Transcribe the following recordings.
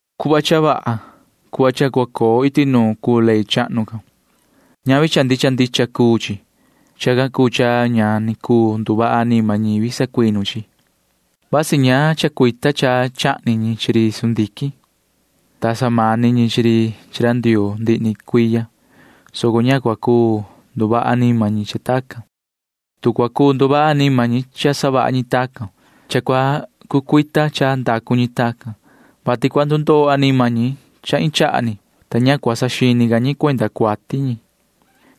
Cuhva cha vaha, cuhva cha cua coo iti nuun cuu ley chahnu can. Ñavi cha ndicha ndicha cuu chi. Chacan cuu cha ña ni cuu nduvaha anima ñivi sacuinu chi chi. Vasi ña chacuita cha chahni ñi chi ri sundiquin, ta samani ñi chi ri chi ra Ndioo ndihi ni cuiya, soco ña cua cuu nduvaha anima ñi cha tacan. Tu cua cuu nduvaha anima ñi cha savaha ñi tacan, cha cua cucuita cha ndacu ñi tacan, vati cua ndundoo anima ñi cha iin chaha ni, ta ña cua saxini ca ñi cuenda cuati ñi.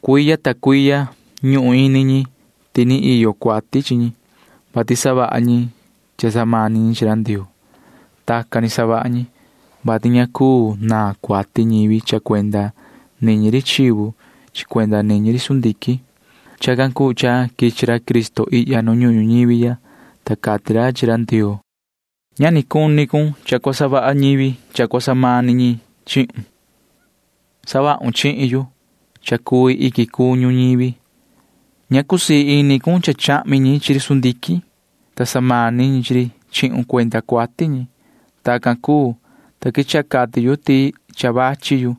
Cuiya ta cuiya ñuhun ini ñi ti ni iyo cuati chi ñi, vati savaha ñi cha samani ñi chi ra Ndioo. Tacan ni savaha ñi, vati ña cuu naan cuati ñivi cha cuenda niñi ri chivu chi cuenda niñi ri sundiquin. Chacan cuu cha quichi ra Cristo ihya nu ñuhun ñuñivi ya, ta cati ra chi ra Ndioo: Ña ni cuni cun cha cua savaha ñivi cha cua samani ñi chihun. Savahun chihin yu cha cui iquin cuñu ñivi. Ña cusii ini cun cha chahmi ñi chi ri sundiquin, ta samani ñi chi ri chihun cuenda cuati ñi. Tacan cuu, ta quechaha cati yu ti cha vachi yu,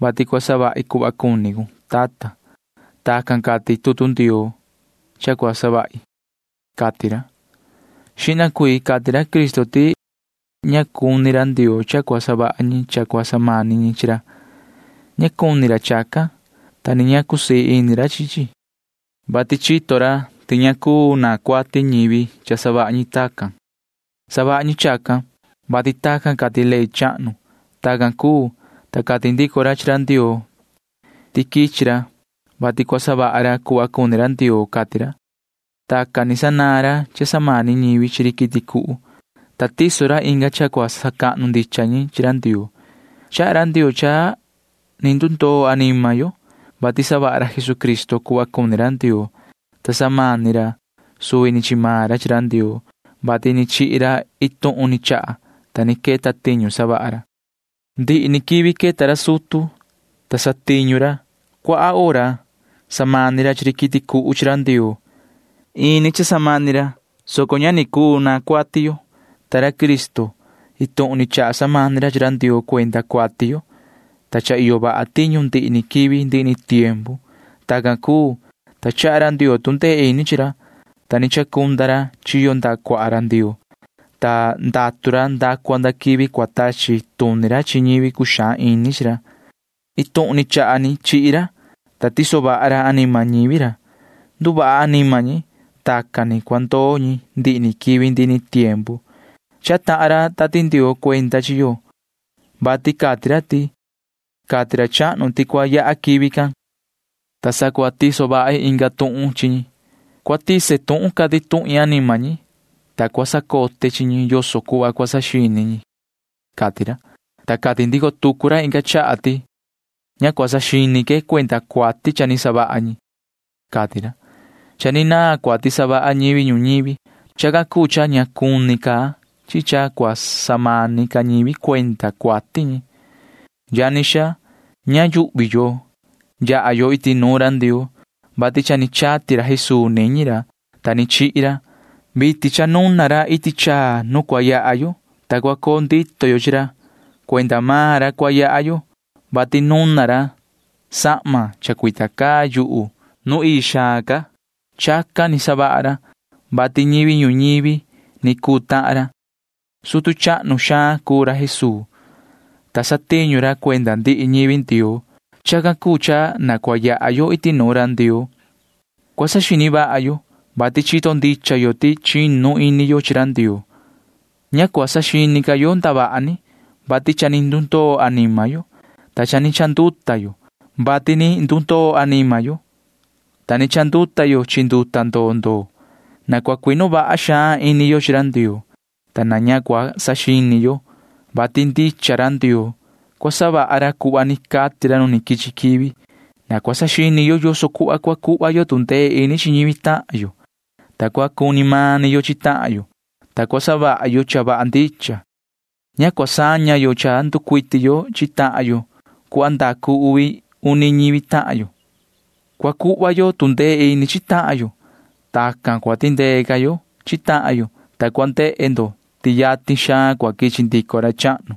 vati cua savahi cuhva cuni cun, tata. Tacan cati tutu Ndioo cha cua savahi, cati ra. Xihna cuii cati ra Cristo ti ña cuni ra Ndioo cha cua savaha ñi cha cua samani ñi chi ra. Ña cuni ra chacan, ta ni ña cusii ini ra chi chi, [vati chito ra ti ña cuu naan cuati ñivi cha savaha ñi tacan]. Savaha ñi chacan, vati tacan cati ley chahnu. Tacan cuu, ta cati ndico ra chi ra Ndioo ti quichi ra, vati cua savaha ra cuhva cuni ra Ndioo, cati ra. Tacan ni sanaan ra cha samani ñivi chi ri quiti cuhu, ta tiso ra inga cha cua sacahnu ndicha ñi chi ra Ndioo. Chaha ra Ndioo cha ni ndundoo anima yo, vati savaha ra Jesucristo cuhva cuni ra Ndioo, ta samani ra suvi ni chi maan ra chi ra Ndioo, vati ni chihi ra iin tuhun ni chaha, ta ni queta tiñu savaha ra. Ndihi quivi queta ra sutu, ta satiñu ra. Cuaha hora samani ra chi ri quiti cuhu chi ra Ndioo. Ini cha samani ra, soco ña ni cuu naan cuati yo. Ta ra Cristo―iin tuhun ni chaha samani ra chi ra Ndioo cuenda cuati yo, ta cha iyo vaha tiñu ndihi ni quivi ndihi ni tiempu. Tacan cuu, ta chaha ra Ndioo tu ndee ini chi ra, ta ni chacunda ra chiyo ndaha cuaha ra Ndioo, ta ndatu ra nda cua nda quivi cua tachi tuni ra chi ñivi cuxaan ini chi ra. Iin tuhun ni chaha ni chihi ra, ta tiso vaha ra anima ñivi ra. Nduvaha anima ñi, ta tacan ni cua ndoo ñi ndihi ni quivi ndihi ni tiempu. Chaha tahan ra Tati Ndioo cuenda chi yo, vati cati ra ti: Cati ra chahnu ti cua yaha quivi can, ta sa cua tiso vahi inga tuhun chi ñi. Cua tise tuhun cati tuhin anima ñi, ta cua sacote chi ñi yoso cuhva cua saxini ñi, cati ra, ta cati ndico tucu ra inga chaha ti: Ña cua saxini que cuenda cuati cha ni savaha ñi, cati ra. Cha ni naan cuati savaha ñivi ñuñivi. Chacan cuu cha ña cuni ca chi cha cua samani ca ñivi cuenda cuati ñi. Yani xaa, ña yuhvi yo yaha yo iti nuun ra Ndioo, vati cha ni chati ra Jesuu niñi ra, ta ni chihi ra. Vitin cha nuna ra iti chaa nu cua yaha yo, ta cua coo ndito yo chi ra. Cuenda maan ra cua yaha yo, vati nuna ra sahma chacuita caa yuhu nu ii xaan ca. Chacan ni savaha ra, vati ñivi ñuñivi ni cuu tahan ra. Sutu cahnu xaan cuu ra Jesuu, ta satiñu ra cuenda ndihi ñivi Ndioo. Chacan cuu cha na cua yaha yo iti nuun ra Ndioo. Cua saxini vaha yo, vati chito ndicha yo ti chinu ini yo chi ra Ndioo. Ña cua saxini ca yo ndavaha ni, vati cha ni ndundoo anima yo, ta cha ni chanduta yo, vati ni ndundoo anima yo, ta ni chanduta yo chi nduta ndoo ndoo. Na cua cuinu vaha xaan ini yo chi ra Ndioo, ta na ña cua saxini yo, vati ndicha ra Ndioo. Cua savaha ra cuhva ni cati ra nu quichi quivi. Na cua saxini yo yoso cuhva cua cuhva yo tu ndee ini chi ñivi tahan yo, ta cua cuni mani yo chi tahan yo, ta cua savaha yo cha vaha ndicha. Ña cua saña yo cha nducuiti yo chi tahan yo cuhva ndacu uvi uni ñivi tahan yo. Cua cuhva yo tu ndee ini chi tahan yo. Tacan cua tindee ca yo chi tahan yo, ta cua ndehe ndo ti yatin xaan cua quichi ndico ra chahnu.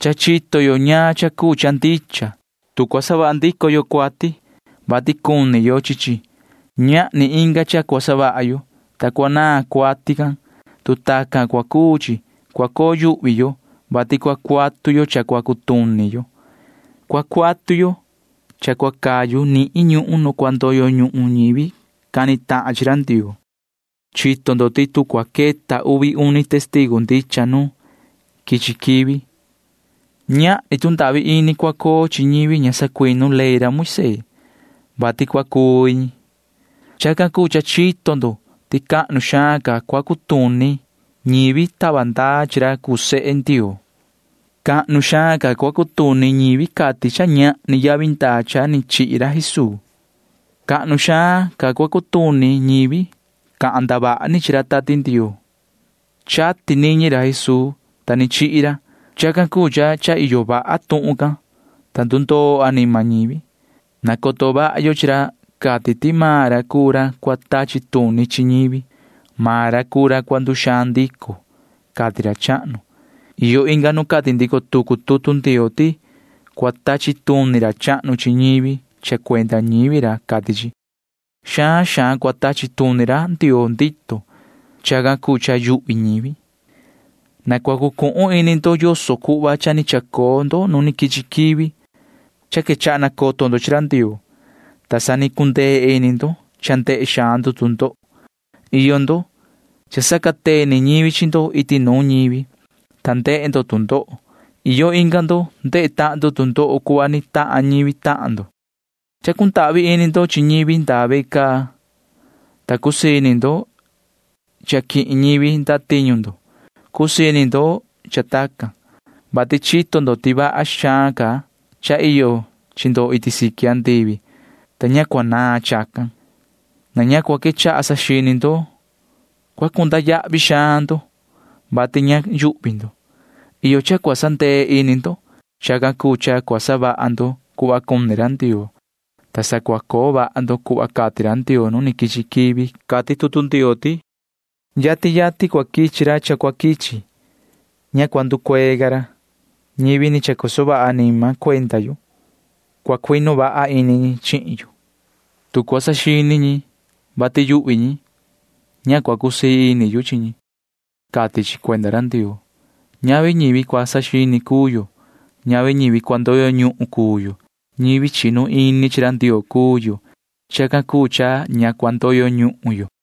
Cha chito yo ñaan cha cuu cha ndicha. Tu cua savaha ndico yo cuati, vati cuni yo chi chi, ñahni inga cha cua savaha yo, ta cua naan cuati can. Tu tacan cua cuu chi, cua coo yuhvi yo, vati cua cuatu yo cha cua cutuni yo. Cua cuatu yo cha cua cayu nihin ñuhun nu cua ndoyo ñuhun ñivi cani tahan chi ra Ndioo. Chito ndo ti tu cua queta uvi uni testigu ndicha nu quichi quivi, ñahni tu ndahvi ini cua coo chi ñivi ña sacuinu ley Moisee, vati cua cuvi ñi. Chacan cuu cha chito ndo ti cahnu xaan cua cutuni ñivi tava ndaa chi ra cuu sehe Ndioo. Cahnu xaan cua cutuni ñivi cati ti cha ñahni yavi ndaa cha ni chihi ra Jesuu. Cahnu xaan cua cutuni ñivi cahan ndavaha ni chi ra Tati Ndioo. Chati niñi ra Jesuu, ta ni chihi ra. Chacan cuu cha cha iyo vaha tuhun can, ta ndundoo anima ñivi. Nacoto vaha yo chi ra cati ti maan ra cuu ra cua tachi tuni chi ñivi. Maan ra cuu ra cua nduxaan ndico, cati ra chahnu. Iyo inga nu cati ndico tucu tutu Ndioo ti cua tachi tuni ra chahnu chi ñivi cha cuenda ñivi ra, cati chi. Xaan xaan cua tachi tuni ra Ndioo ndito. Chacan cuu cha yuhvi ñivi. Na cua cucuhun ini ndo yoso cuhva cha ni chacoo ndo nu quichi quivi. Cha quechaha nacoto ndo chi ra Ndioo, ta sa ni cundee ini ndo cha ndehe xaan ndo tu ndoho. Iyo ndo―cha sacateni ñivi chi ndo iti nuun ñivi, ta ndehe ndo tu ndoho. Iyo inga ndo ndehe tahan tu ndoho cuhva ni tahan ñivi tahan ndo. Cha cundahvi ini ndo chi ñivi ndaa ve caa, ta cusii ini ndo cha quihin ñivi ndatiñu ndo. Cusii ini ndo cha tacan, vati chito ndo ti vaha xaan ca cha iyo chi ndo iti siqui andivi, ta ña cua naan chacan. Na ña cua quechaha saxini ndo. Cua cunda yahvi xaan ndo, vati ña yuhvi ndo. Iyo cha cua sandee ini ndo. Chacan cuu cha cua savaha ndo cuhva cuni ra Ndioo, ta sa cua coo vaha ndo cuhva cati ra Ndioo nu quichi quivi. Cati tutu Ndioo ti: Yatin yatin cua quichi ra cha cua quichi. Ña cua nducuee ca ra. Ñivi ni chacoso vaha anima cuenda yu―cua cuinu vaha ini ñi chihin yu. Tu cua saxini ñi, vati yuhvi ñi, ña cua cusii ini yu chi ñi, cati chi cuenda ra Ndioo. Ñavi ñivi cua saxini cuu yo. Ñavi ñivi cua ndoyo ñuhun cuu yo. Ñivi chinu ini chi ra Ndioo cuu yo. Chacan cuu cha ña cua ndoyo ñuhun yo.